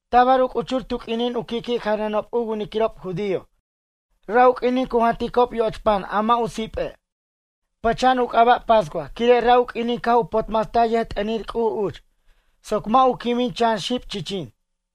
Tabar u c'uchur tu q'uinin u qui'qui' janʌnob u winiquirob judío ra' u q'uinin cu janticob yoch pan a mʌ' u sipe'. Pʌcha'an u c'aba' pascua quire' ra' u q'uinin caj u potmastaj yʌjt'ʌnir C'uj uch soc mʌ' u quimin chan xib chichin.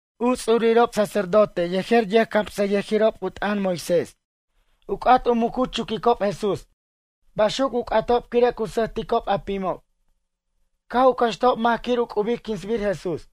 U ts'urirob sacerdote yejer yʌjcamsʌyʌjirob u t'ʌn Moisés, u c'at u muc u chuquicob Jesús. Baxuc u c'atob quire' cu sʌjticob a pimob. Caj u cʌxtajob mac quir u c'ubic quinsbir Jesús.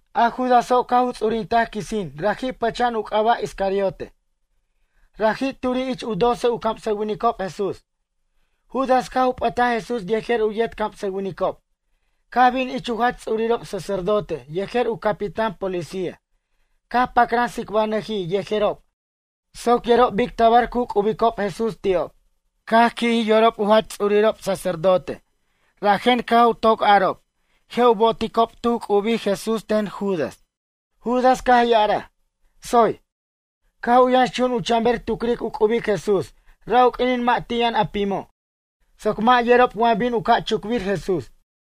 A Judaso' caj u ts'urintaj quisin raji' pʌcha'an u c'aba' Iscariote, raji' turi' ich u doce u camsʌwinicob Jesús. Judas caj u p'ʌtaj Jesús yejer u yet camsʌwinicob caj bin ich u jach ts'urirob sacerdote yejer u capitán policía caj pacran tsicbanʌjij yejerob soc yerob bic tabar cu c'ubic Jesús ti'ob. Caj qui'jij yorob u jach ts'urirob sacerdote rajen caj u toc arob je' u boticob tu c'ubij Jesús ten Judas. Judas caj ya'araj: ―Tsoy. Caj u yʌnxchun u chanber tucric u c'ubic Jesús ra' u q'uinin mʌ' ti' yʌn a pimo', soc mʌ' yerob wa bin u ca' chucbir Jesús.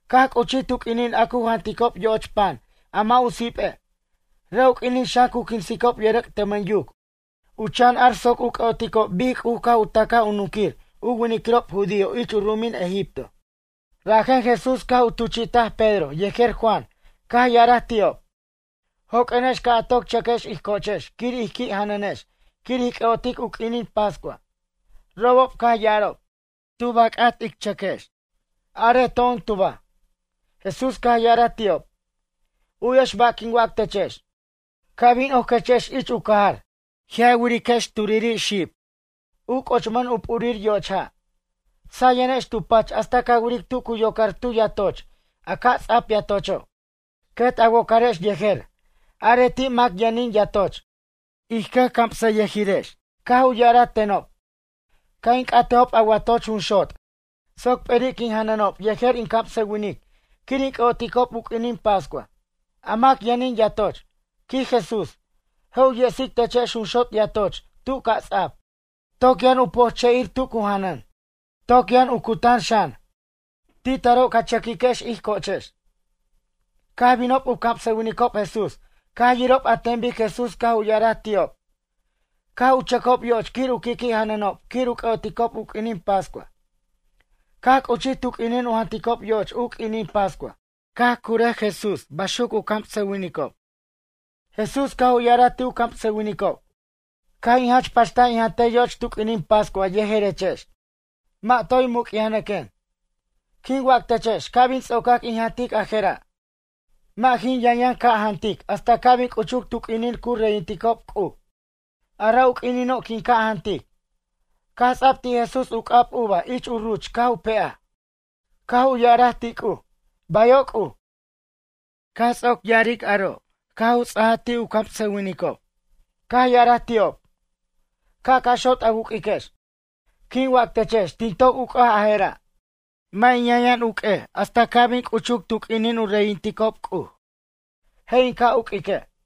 Caj c'uchij tu q'uinin a cu janticob yoch pan a mʌ' u sipe'. Ra' u q'uinin xan cu quinsicob yʌrʌc' tʌmʌn yuc u chan ar soc u c'ʌ'otic bic C'uj caj u ta'caj u nunquir u winiquirob judío ich u ru'umin Egipto. Rajen Jesús caj u tuchi'taj Pedro yejer Juan caj ya'araj ti'ob: ―Joq'uenex ca' a toc chʌquex ij cochex quir ij qui' janʌnex quir ij c'ʌ'otic u q'uinin pascua. Robob caj ya'arob: ―Tub a c'at ic chʌquex? Arej to'on tuba? Jesús caj ya'araj ti'ob: ―U'yex ba' quin waquex techex. Ca' bin oquechex ich u cajar, je' a wiriquex xib turiri', u c'ochmʌn u p'urir yoch ja'. Sayenex tu pach hasta ca wiric tu cu yocar tu yatoch a ca' ts'ap yatocho'. Quet a wocarex yejer. Arej ti' mac yʌnin yatoch: “Ij cʌjcamsʌyʌjirex caj u ya'araj tenob ca' in c'atejob a watoch junxot' soc p'eri' quin janʌnob yejer in camsawinic quir in c'ʌ'oticob u q'uinin pascua.” A mac yʌnin yatoch ―quij Jesús―, je' u yestic techex junxot' yatoch tu ca' ts'ap, toc yʌn u pojche'ir tu cu janʌn. Toc yʌn u cutan xan. Ti taro' ca chʌquiquex ij cochex. Caj binob u camsʌwinicob Jesús caj yirob an ten bic Jesús caj u ya'araj ti'ob, caj u chʌcob yo'och quir u qui' janʌnob quir u c'ʌ'oticob u q'uinin pascua. Caj c'uchij tu q'uinin u janticob yoch u q'uinin pascua caj curaj Jesús baxuc u camsʌwinicob. Jesús caj u ya'araj ti' u camsʌwinicob: ―Caj in jach pachtaj in jantej yoch tu q'uinin pascua yejerechex. Mʌ' toy muc'yajnʌquen. Quin wac techex ca' bin ts'ocac in jantic a je'ra'. Mʌ' jin yʌn yʌn ca' jantic hasta ca' bin c'uchuc tu q'uinin cu reyinticob C'uj. A ra' u q'uinino' quin ca' jantic. Caj ts'a'b ti' Jesús u c'ab uva ich ruch caj u pe'aj. Caj u ya'araj ti' C'uj: ―Bayo' C'uj. Caj ts'oc ya'aric aro' caj u ts'aj ti' u camsʌwinicob, caj ya'araj ti'ob: ―Ca' ca' xot' a wuq'uiquex. Quin wac techex tin toc uc'aj a je'ra'. Mʌ' in yʌn yʌn uq'uej hasta ca' bin c'uchuc tu q'uinin u reyinticob C'uj. Je' in ca' uq'uique'.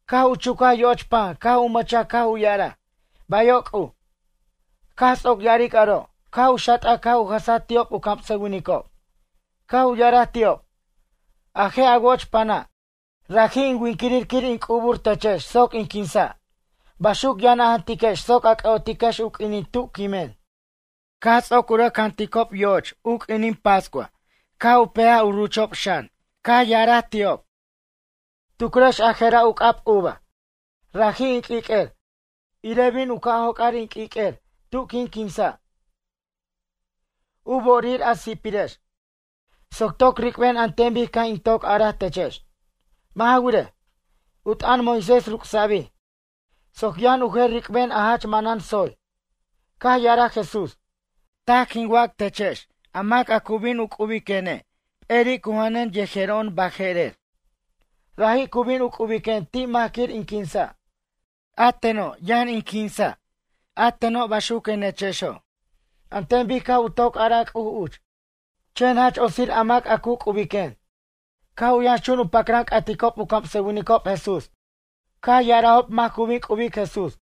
Caj u chuca yoch pan caj u mʌchaj caj u ya'araj: ―Bayo' C'uj. Caj ts'oc ya'aric aro' caj u xat'aj caj u jʌsej ti'ob u camsʌwinicob. Caj u ya'araj ti'ob: ―A je' a woch pana', raji' in winquirir quir in c'ubʌr techex soc in quinsa'. Baxuc yʌn a jantiquex soc a c'ʌ'otiquex u q'uinin tu quimen. Caj ts'oc u rʌc janʌnob yoch u q'uinin pascua ca' u pe'aj a rucho' xan caj ya'araj ti'ob: ―Tucrex a je'ra' u c'ab uva, raji' in q'uiq'uer. Irej bin u ca' joc'ar in q'uiq'uir tu quin quinsa', u bo'orir a si'pirirex. Soc toc ric'ben an ten bic caj in toc araj techex. Mʌ' ja wirej, u t'ʌn Moisés ruc'sabij soc yʌn u jer ric'ben a jach manan tsoy. Caj ya'araj Jesús: ―Taj quin wac techex a mac cu bin u c'ubiquene' p'eri' cu janʌn yejero'on baje'rer. Raji' cu bin u c'ubiquen ti' mac quir in quinsa'. A teno', yʌn in quinsa' a teno', baxuquenechexo'. An ten bic caj u toc araj C'uj uch. Chen jach otsir a mac a cu c'ubiquen. Caj u yʌnxchun u pacran c'aticob u camsʌwinicob Jesús. Caj ya'arajob mac cu bin c'ubic Jesús.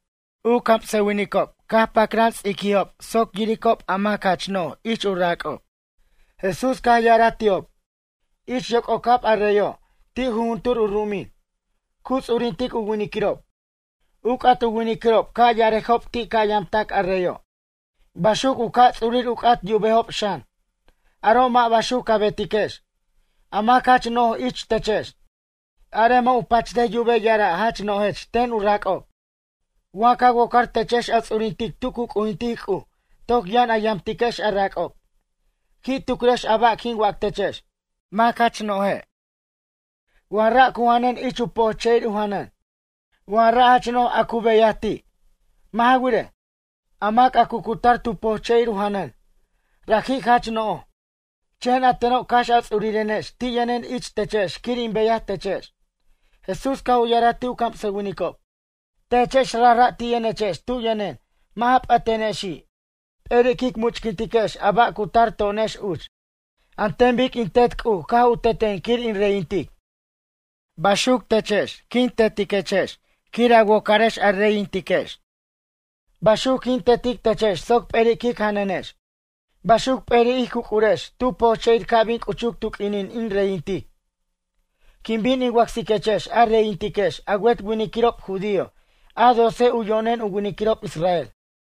U camsʌwinicob caj u pacran ts'ictarob soc yiricob a mac jach no'j ich u rac'ob. Jesús caj ya'araj ti'ob: ―Ich yoc'ocab a reyo' ti' jujuntur u ru'umin, cu ts'urintic u winiquirob. U c'at u winiquirob ca' ya'arejob ti' ca' yamtac a reyo'. Baxuc u ca' ts'urir u c'at yubejob xan. Aro' mʌ' baxuc ca betiquex. A mac jach no'j ich techex, arej mʌ' u pachtej yubej ya'ara' jach no'jech ten u rac'ob. Wa ca wocar techex a ts'urintic tu cu c'ujintic C'uj toc yʌn a yamtiquex a rac'ob. Qui' tucrex a ba' quin wac techex. Mac jach no'je', wa ra' cu janʌn ich u pojche'ir u janʌn? Wa ra' jach no'j a cu beyaj ti'? Mʌ' ja wirej, a mac a cu cutar tu pojche'ir u janʌn, raji' jach no'j. Chen a teno' cax a ts'urirenex ti' yʌnen ich techex quir in beyaj techex. Jesús caj u ya'araj ti' u camsʌwinicob: ―Techex rajra' ti' yʌnechex tu yʌnen mʌ' ja p'ʌtenexi' p'eri' quic muc'tiquex a ba' cu tar to'onex uch. An ten bic in Tet C'uj caj u teten quir in reyintic. Baxuc techex in tetiquechex quir a wocarex a reyintiquex. Baxuc quin tetic techex soc p'eri' quic janʌnex. Baxuc p'eri' ij cuc'urex tu pojche'ir ca' bin c'uchuc tu q'uinin in reyintic. Quin bin in wacsiquechex a reyintiquex a wet winiquirob judío a doce u yo'nen u winiquirob Israel.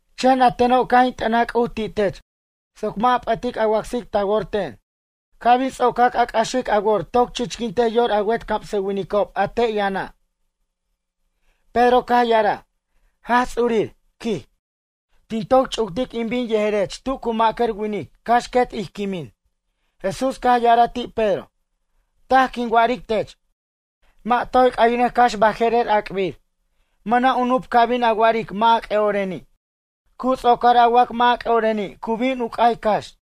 Chen a teno' caj in t'ʌnaj C'uj ti' tech soc mʌ' a p'ʌtic a wacsic ta wor ten. Ca' bin ts'ocac a c'axic a wor toc chichquintej yor a wet camsʌwinicob a te' yʌna'. Pedro caj ya'araj: ―Jaj Ts'urir ―quij―, tin toc ch'uctic in bin yejerech tu cu ma'cʌr winic cax quet ij quimin. Jesús caj ya'araj ti' Pedro: ―Taj quin wa'aric tech. Mʌ' toy c'ʌynʌc cax baje'rer ac'bir. Mʌna' u nup ca bin a wa'aric mʌ' a c'ʌ'oreni'. Cu ts'ocor a wac mʌ' a c'ʌ'oreni' cu bin u c'ay cax.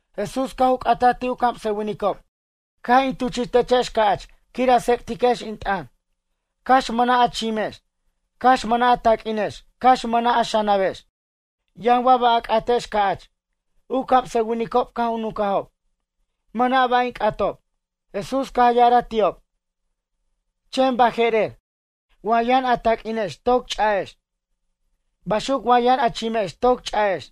Jesús caj u c'ataj ti' u camsʌwinicob: ―Caj in tuchi'techex ca'ch quir a tsec'tiquex in t'ʌn. Cax mʌna' a chimex. Cax mʌna' a taq'uinex cax mʌna' a xanabex. Yʌn wa ba' a c'atex ca'ch? U camsʌwinicob caj u nuncajob: ―Mʌna' ba' in c'atob. Jesús caj ya'araj ti'ob: ―Chen baje'rer, wa yʌn a taq'uinex toc ch'a'ex. Baxuc wa yʌn a chimex toc ch'a'ex.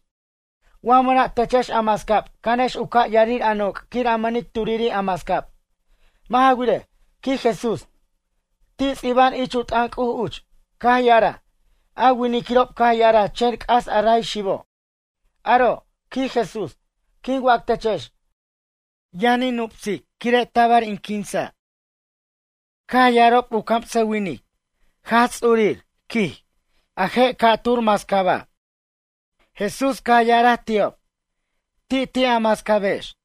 Wa mʌna' techex a mascab canex u ca' yarir a noc' quir a mʌnic turiri' a mascab. Mʌ' ja wirej ―quij Jesús―, ti' ts'iba'an ich u t'ʌn C'uj uch, caj ya'araj: “A winiquirob caj ya'araj chen c'as a ray xibo'.” Aro' ―quij Jesús―, quin wac techex. Yʌn in nupsej quire' tabar in quinsa'. Caj ya'arob u camsʌwinic: ―Jaj Ts'urir ―quij―, a je' mascaba' ca'tura'. Jesús caj ya'araj ti'ob: ―Ti' ti' a mascabex.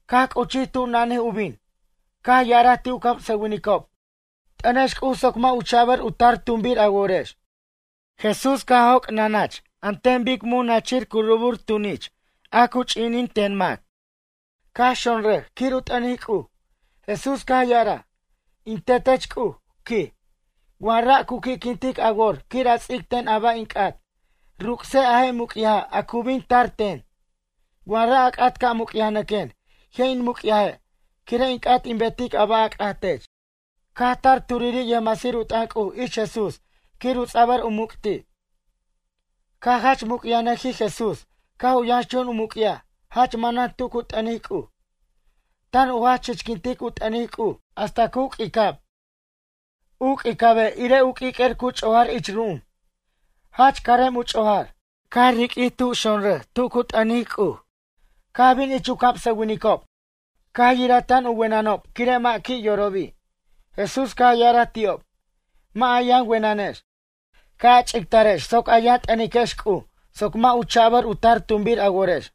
Caj c'uchij tu nanij u bin, caj ya'araj ti' u camsʌwinicob: ―T'ʌnex C'uj soc mʌ' u cha'ba' u tar tumbir a worex. Jesús caj joc' nanach an ten bic mun nachir cu rubur tunich a cu ch'inin ten mac. Caj xonrʌj quir u t'ʌnic C'uj. Jesús caj ya'araj: ―In Tetech C'uj ―quij―, wa ra' cu qui'quintic a wor quir a ts'icten a ba' in c'at, ruc'sej a je' muc'yaja' a cu bin tar ten. Wa ra' a c'at ca' muc'yajnʌquen je' in muc'yaje' quire' in c'at in betic a ba' a c'at tech. Caj tar turiri' yʌjmasir u t'ʌn C'uj ich Jesús quir u ts'abʌr u muc' ti'. Caj jach muc'yajnʌjij Jesús caj u yʌnxchun u muc'yaj jach manan tu cu t'ʌnic C'uj. Tan u jach chichquintic u t'ʌnic C'uj hasta cu q'uicab. U q'uicabe' irej u q'uiq'uer cu ch'ojar ich ru'um. Jach carem u ch'ojar. Caj riq'uij tub xonrʌj tu cu t'ʌnic C'uj. Caj bin ich u camsʌwinicob caj yiraj tan u wenʌnob quire' mʌ' qui' yorobi'. Jesús caj ya'araj ti'ob: ―Mʌ' a yʌn wenʌnex. Ca' a ch'ictarex soc a yʌn t'ʌniquex C'uj soc mʌ' u cha'bʌr u tar tumbir a worex.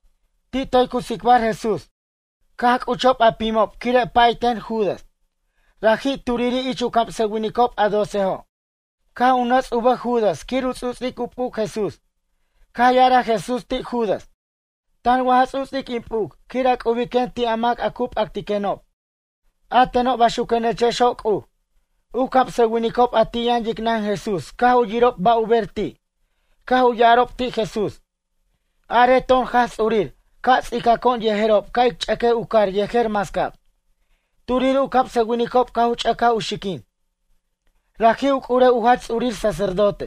Ti' toy cu tsicbar Jesús. Caj c'uchob a pimob quire' pay ten Judas. Raji' turiri' ich camsʌwinicob a docejo'. Caj u nʌts' u bʌj Judas quir u ts'uts'ic u p'uc Jesús. Caj ya'araj Jesús ti' Judas: ―Tan wa ja ts'uts'ic in p'uc quir a c'ubiquen ti' a mac a cu p'actiquenob? A teno' baxuquenechexo' C'uj. U camsʌwinicob a ti' yʌn yicnan Jesús caj u yirob ba' u ber ti', caj u ya'arob ti' Jesús: ―Arej to'on Jaj Ts'urir ca' ts'icaco'on yejerob ca' ic ch'ʌquej u car yejer mascab. Turiri' u camsʌwinicob caj u ch'ʌcaj u xiquin, raji' u c'urew u jach ts'urir sacerdote.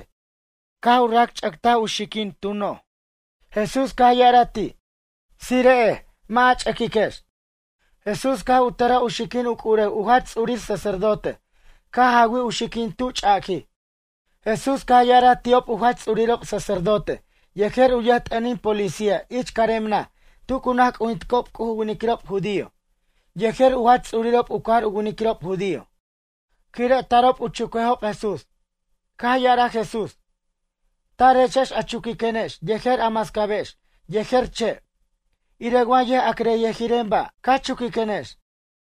Caj u rac ch'ʌctaj u xiquin, tu noj. Jesús caj ya'araj ti': ―Tsire'ej, mʌ' a ch'ʌquiquex. Jesús caj u tʌra u xiquin u c'urew u jach ts'urir sacerdote caj jawij u xiquin tu ch'aquij. Jesús caj ya'araj ti'ob u jach ts'urirob sacerdote yejer u yʌjt'ʌnin policía ich carem naj tu cu naj c'ujinticob C'uj u winiquirob judío, yejer u jach ts'urirob u cajar u winiquirob judío. Quire' tarob u chuquejob Jesús. Caj ya'araj Jesús: ―Tarechex a chuquiquenex yejer a mascabex yejer che'. Irej wa yʌja'crʌyʌjiren ba', ca chuquiquenex.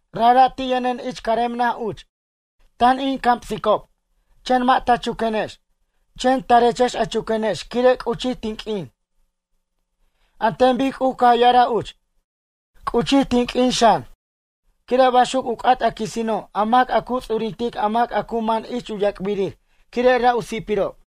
Rajra' ti' yʌnen ich carem naj uch. Tan in camsicob, chen mʌ' ta chuquenex. Chen tarechex a chuquenex quire' c'uchij tin q'uin. An ten bic C'uj caj ya'araj uch. C'uchij tin q'uin xan, quire' baxuc u c'at a quisino' a mac a cu ts'urintic a mac a cu man ich yac'birir quire' ra' u si'pirob.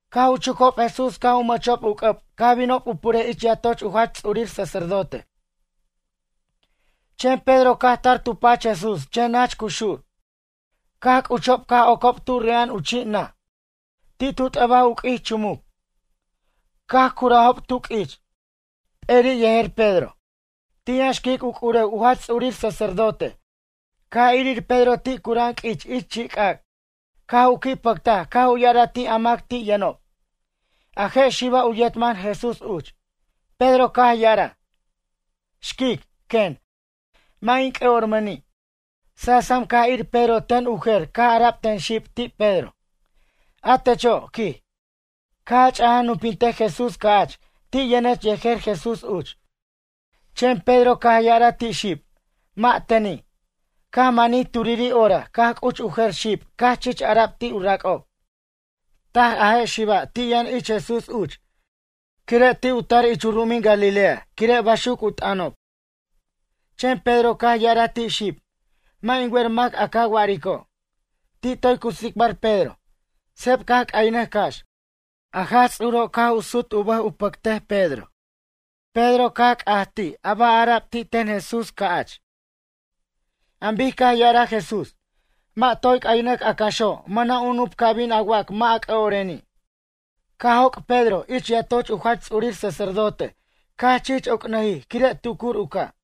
Caj u chucob Jesús caj u mʌchob u c'ʌb caj binob u purej ich yatoch u jach ts'urir sacerdote. Chen Pedro caj tar tu pach Jesús chen nach cu xur. Caj c'uchob caj ocob tu re'a'an u chi' naj. Ti' tu t'ʌbaj u q'uich chumuc. Caj curajob tu q'uich. P'eri' yejer Pedro. Ti' yʌn xquic u c'urew u jach ts'urir sacerdote caj irir Pedro ti' cura'an q'uich ich chi' c'ac'. Caj u qui' pʌctaj caj u ya'araj ti' a mac ti' yʌnob: ―A je' xiba' u yet man Jesús uch. Pedro caj ya'araj: ―Xquic ―quen―, mʌ' in c'ʌ'ormʌni'. Sasam caj irir Pedro ten u jer caj ara'b ten xib ti' Pedro: ―A techo' ―quij―, caj a chaj nupintej Jesús ca'ch, ti' yʌnech yejer Jesús uch. Chen Pedro caj ya'araj ti' xib: ―Mʌ' teni'. Caj manij turiri' hora caj c'uch u jer xib caj chich ara'b ti' u rac'ob: ―Taj a je' xiba' ti' yʌn ich Jesús uch. Quire' ti' u tar ich u ru'umin Galilea quire' baxuc u t'ʌnobob. Chen Pedro caj ya'araj ti' xib: ―Mʌ' in wer mac a ca wa'arico'. Ti' toy cu tsicbar Pedro, seb caj c'aynʌj cax. A Jaj Ts'uro' caj u sut u bʌj u pʌcaj Pedro. Pedro caj c'aj ti' a ba' ara'b ti' ten Jesús ca'ch. An bic caj ya'araj Jesús: “Mʌ' toy c'aynʌc a caxo' mʌna' u nup ca bin a wac mʌ' a c'ʌ'oreni'.” Caj joc' Pedro ich yatoch u jach ts'urir sacerdote caj chich oc'nʌjij quire' tucur u ca'.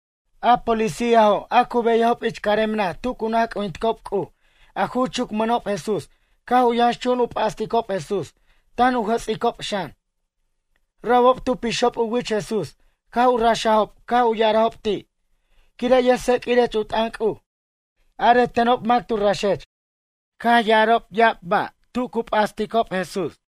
A policíajo' a cu beyajob ich carem naj tu cu naj c'ujinticob C'uj a ju chucmʌnob Jesús caj u yʌnxchun u p'asticob Jesús tan u jʌts'icob xan. Robob tu pixob u wich Jesús caj u raxob caj u ya'arob ti': ―Quire' yʌjtseq'uirech u t'ʌn C'uj, arej tenob mac tu raxech? Caj ya'arob ya'ab ba' tu cu p'asticob Jesús.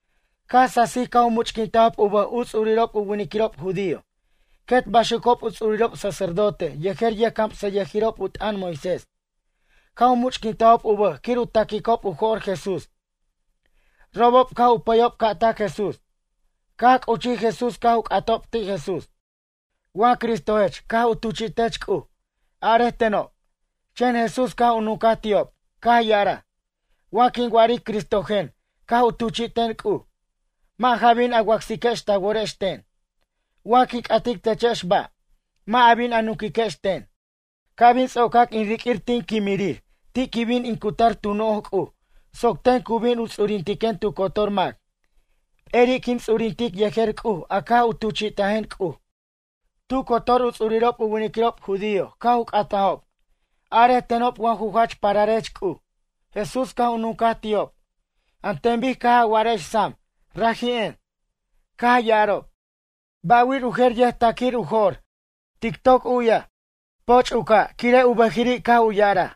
Caj sasij caj u much'quintajob u bʌj u ts'urirob u winiquirob judío. Quet baxucob u ts'urirob sacerdote yejer yʌjcamsʌyʌjirob u t'ʌn Moisés. Caj u much'quintajob u bʌj quir u ta'quicob u jo'r Jesús. Robob caj u pʌyob ca' tac Jesús. Caj c'uchij Jesús caj u c'atob ti' Jesús: ―Wa Cristojech caj u tuchi'tech C'uj, arej tenob? Chen Jesús caj u nuncaj ti'ob, caj ya'araj: ―Wa quin wa'aric Cristojen caj u tuchi'ten C'uj, mʌ' ja bin a wacsiquex ta worex ten. Wa quin c'atiquex techex ba', mʌ' a bin a nunquiquex ten. Ca' bin ts'ocac in riq'uir tin quimirir ti' quin bin in cutar tu noj C'uj soc ten cu bin u ts'urintiquen tu cotor mac. P'eri' quin ts'urintic yejer C'uj a caj u tuchi'tajen C'uj. Tu cotor u ts'urirob u winiquirob judío caj u c'atajob: ―Arej tenob wa ju jach pararech C'uj? Jesús caj u nuncaj ti'ob: ―An ten bic caj a wa'arex sam, raji'en. Caj ya'arob: ―Ba' wir u jer yʌjta'quic u jo'r. Tic toc u'yaj. Poch' u ca' quire' u bʌjiri' caj u ya'araj.